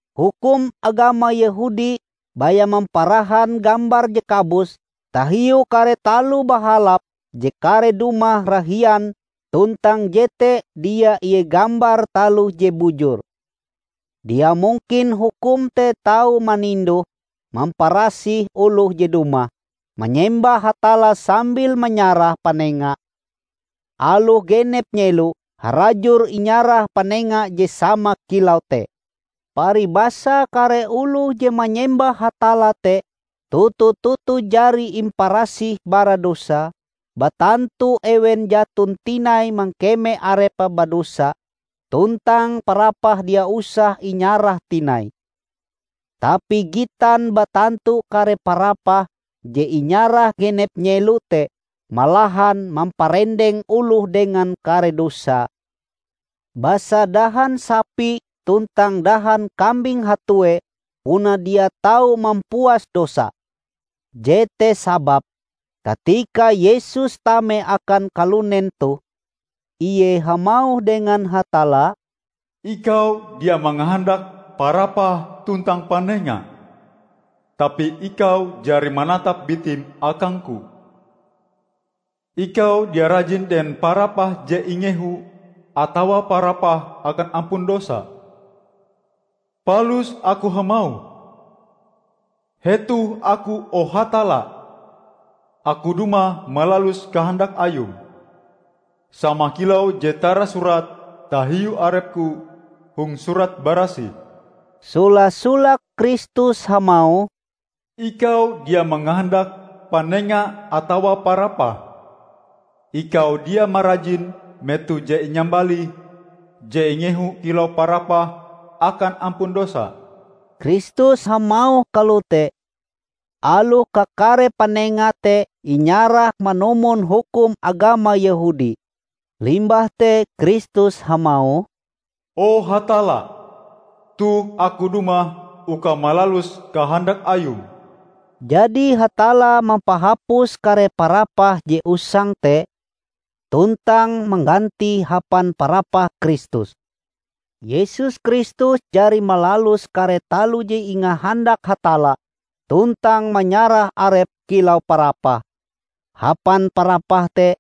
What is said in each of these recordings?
Hukum agama Yehudi baya mamparahan gambar je kabus tahiu kare taloh bahalap je kareh dumah rahian tuntang jete dia ie gambar taloh je bujur. Dia mungkin hukum te tau maninduh-mamparasih oloh je dumah manyembah Hatalla sambil manyarah panenga, aloh genep nyelo harajur inyarah panenga je sama kilau te. Paribasae kare oloh je manyembah Hatalla te toto-toto jari imparasih bara dosae, batantu ewen jaton tinai mangkeme arepe badosa, tuntang parapah dia usah inyarah tinai. Tapi gitan batantu kare parapah je inyarah genep nyelo te malahan mamparendeng oloh dengan kare dosae, basa dahan sapi tuntang dahan kambing hatuee puna dia tau mampuas dosa. Jete sababe katika Yesus tame akan kalunen toh, Ie hamauh dengan Hatalla, "Ikau dia mangahandak parapah tuntang panenga; tapi Ikau jari manatap bitim akang-Ku. Ikau dia rajin dengan parapah je ingehu atawa parapah akan ampun dosa. Palus aku hamauh, 'Hetoh Aku, o Hatalla! Aku dumah malalus kahandak Ayum, sama kilau je tarasurat tahiu arep-Ku hong Surat Barasih.' " Sola-solake Kristus hamauh, "Ikau dia mangahandak panenga atawa parapah; Ikau dia marajin meto je inyambalih je ingehu kilau parapah akan ampun dosa." Kristus hamauh kalote, aloh kakare panenga te inyarah manumon hukum agama Yehudi. Limbah te Kristus hamauh, "O Hatalla! Toh aku dumah uka malalus kahandak Ayum." Jadi Hatalla mampahapus kare parapah je usang te, tuntang manggantie hapan parapah Kristus. Yesus Kristus jari malalus kare taloh je ingahandak Hatalla tuntang manyarah Arepe kilau parapah. Hapan parapah te,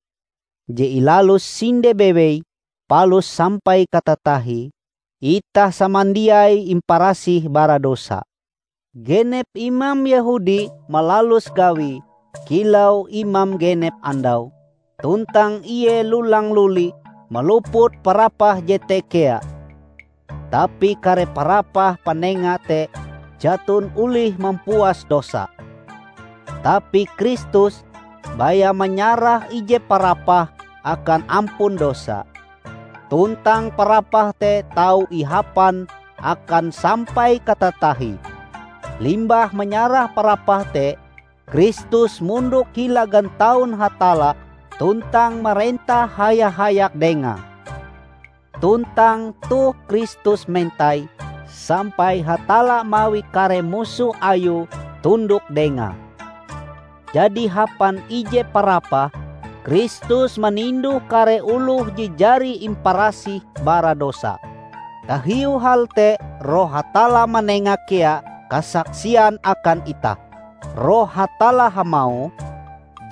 je ilalus sinde bewei palus sampai katatahie, itah samandiai imparasih bara dosa. Genep imam Yehudi malalus gawie kilau imam genep andau, tuntang Ie lulang-luli maluput parapah jete kea. Tapi kare parapah panenga te jaton olih mampuas dosa. Tapi Kristus, baya manyarah ije parapah akan ampun dosa, tuntang parapah te tau ihapan akan sampai katatahie. Limbah manyarah parapah te, Kristus mondok hila gantaun Hatalla tuntang marentah haya-hayak Dengae. Tuntang toh Kristus mentai sampai Hatalla mawi kare musoh Ayue tundok Dengae. Jadi hapan ije parapah, Kristus maninduh kare oloh je jari imparasih bara dosa. Tahiu hal te Roh Hatalla manenga kea kasaksian akan itah. Roh Hatalla hamauh,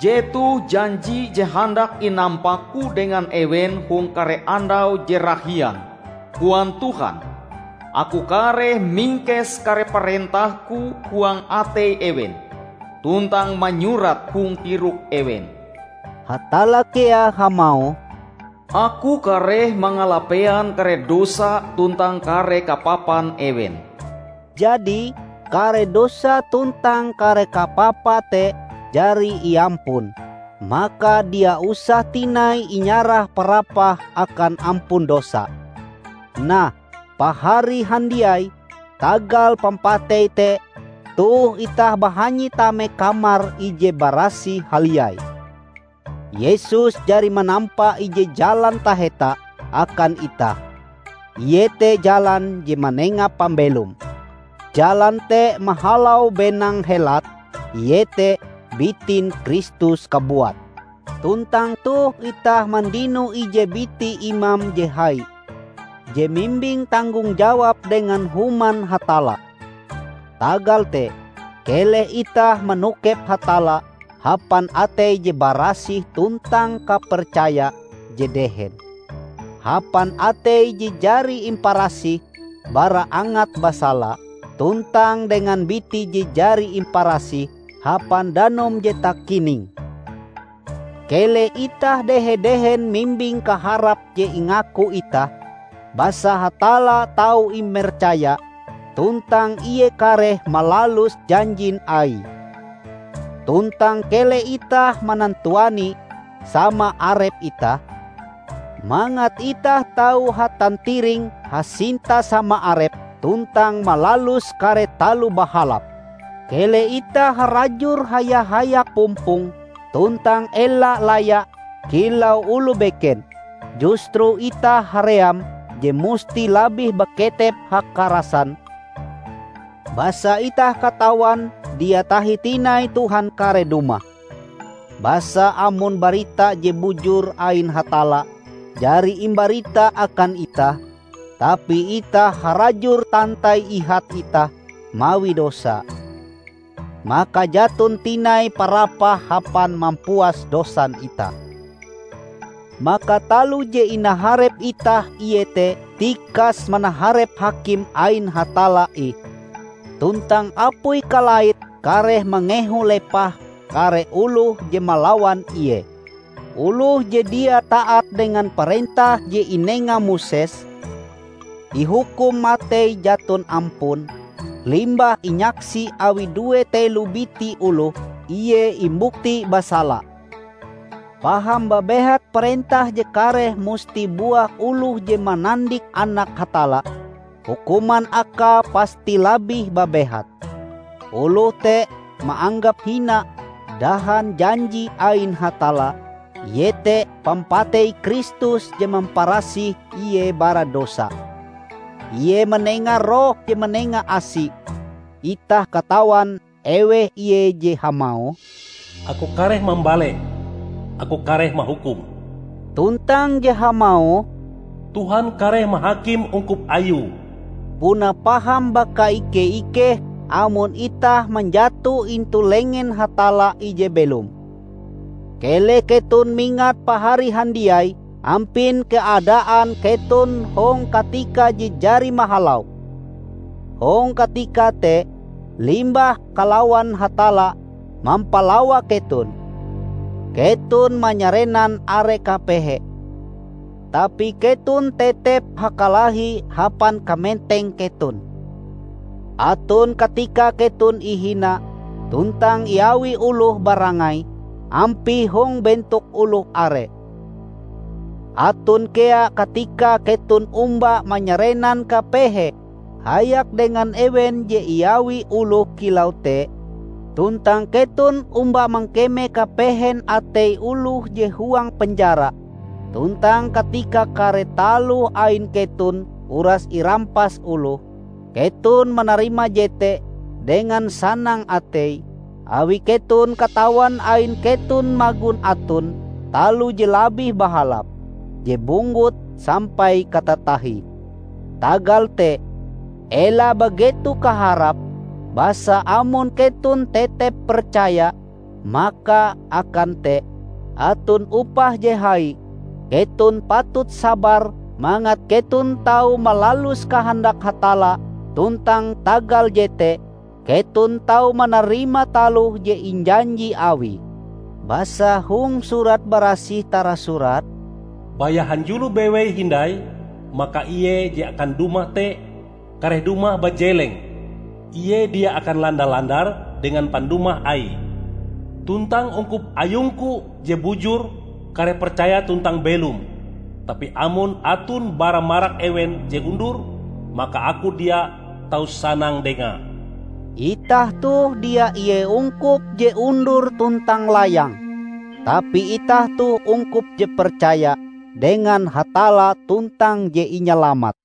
" 'Jetoh janji je handak inampa-Ku dengan ewen hong kare andau je rahian,' koan Tuhan, 'Aku kareh mingkes kare parentah-Ku huang atei ewen, tuntang manyurate hong tirok ewen.' " Hatalla kea hamauh, "Aku kareh mangalapean kare dosa tuntang kare kapapan ewen." Jadi, kare dosa tuntang kare kapapa te jari iampun, maka dia usah tinai inyarah parapah akan ampun dosa. Nah, Pahari handiai, tagal pampatei te toh itah bahanyi tame Kamar Ije Barasih Haliai. Yesus jari manampa ije jalan taheta akan itah, iete jalan je manenga pambelom. Jalan te mahalau benang helat, iete bitin Kristus kabuat. Tuntang toh itah mandino ije biti imam je hai, je mimbing tanggong jawab dengan Human Hatalla. Tagal te, keleh itah manokep Hatalla hapan atei je barasih tuntang kapercaya je dehen; hapan atei je jari imparasih bara angat basala, tuntang dengan biti je jari imparasih hapan danum je takining. Keleh itah dehe-dehen mimbing kaharap je ingaku itah, basa Hatalla tau imercaya tuntang Ie kareh malalus janjin Aie. Tuntang keleh itah manantuani sama arep itah, mangat itah tau hatantiring hasinta sama arep tuntang malalus kare taloh bahalap. Keleh itah harajur haya-hayak pumpong, tuntang ela laya kilau oloh beken. Justru itah haream je musti labih baketep hakarasan, basa itah katawan dia tahi tinai Tuhan kareh dumah. Basa amon barita je bujur ain Hatalla jari imbarita akan itah, tapi itah harajur tantai ihat itah mawi dosa, maka jaton tinai parapah hapan mampuas dosan itah. Maka taloh je inaharep itah iete tikas manaharep hakim ain Hatalla ih tuntang apui kalaite kareh mangehu lepah kare oloh je malawan Ie! Oloh je dia taat dengan parentah je inenga Moses, ihukum matei jaton ampun, limbah inyaksi awi due telo biti oloh, ie imbukti basala. Paham babehat parentah je kareh musti buah oloh je manandik Anak Hatalla, hukuman akae pasti labih babehat. Oloh te maanggap hina dahan janji ain Hatalla, iete pampatei Kristus je mamparasih ie bara dosa. Ie manenga Roh je manenga asi. Itah katawan eweh Ie je hamauh, "Aku kareh mambaleh! Aku kareh mahukum!" tuntang je hamauh, "Tuhan kareh mahakim ungkup Ayue." Puna paham bakaike-ikeh amon itah manjato intu lengen Hatalla Ije Belom! Keleh keton mingat pahari handiai ampin keadaan keton hong katika je jari mahalau. Hong katika te, limbah kalawan Hatalla mampalawa keton, keton manyarenan are kapehe; tapi keton tetep hakalahi hapan kamenteng keton. Aton katikae keton ihina tuntang iawi oloh barangai ampie hong bentok oloh are. Aton kea katikae keton omba manyarenan kapehe hayak dengan ewen je iawi oloh kilau te, tuntang keton omba mangkeme kapehen atei oloh je huang penjara. Tuntang katika kare taloh ain keton uras irampas oloh, keton manarima jete dengan sanang atei, awi keton katawan ain keton magon aton taloh je labih bahalap, je bunggut sampai katatahie. Tagal te, ela bageto kaharap, basa amon keton tetep percaya, maka akan te aton upah je hai! Keton patut sabar mangat keton tau malalus kahandak Hatalla tuntang tagal jete keton tau manarima taloh je injanji Awie. Basa hong Surat Barasih tarasurat, "Baya hanjulo bewei hindai, maka Ie je akan dumah te, kareh dumah bajeleng; Ie dia akan landa-landar dengan pandumah Aie. Tuntang ungkup ayung-Ku je bujur kareh percaya tuntang belom; tapi amon aton bara marak ewen je undur, maka Aku dia tau sanang dengae." Itah toh dia ie ungkup je undur tuntang layang. Tapi itah toh ungkup je percaya dengan Hatalla tuntang je inyalamat.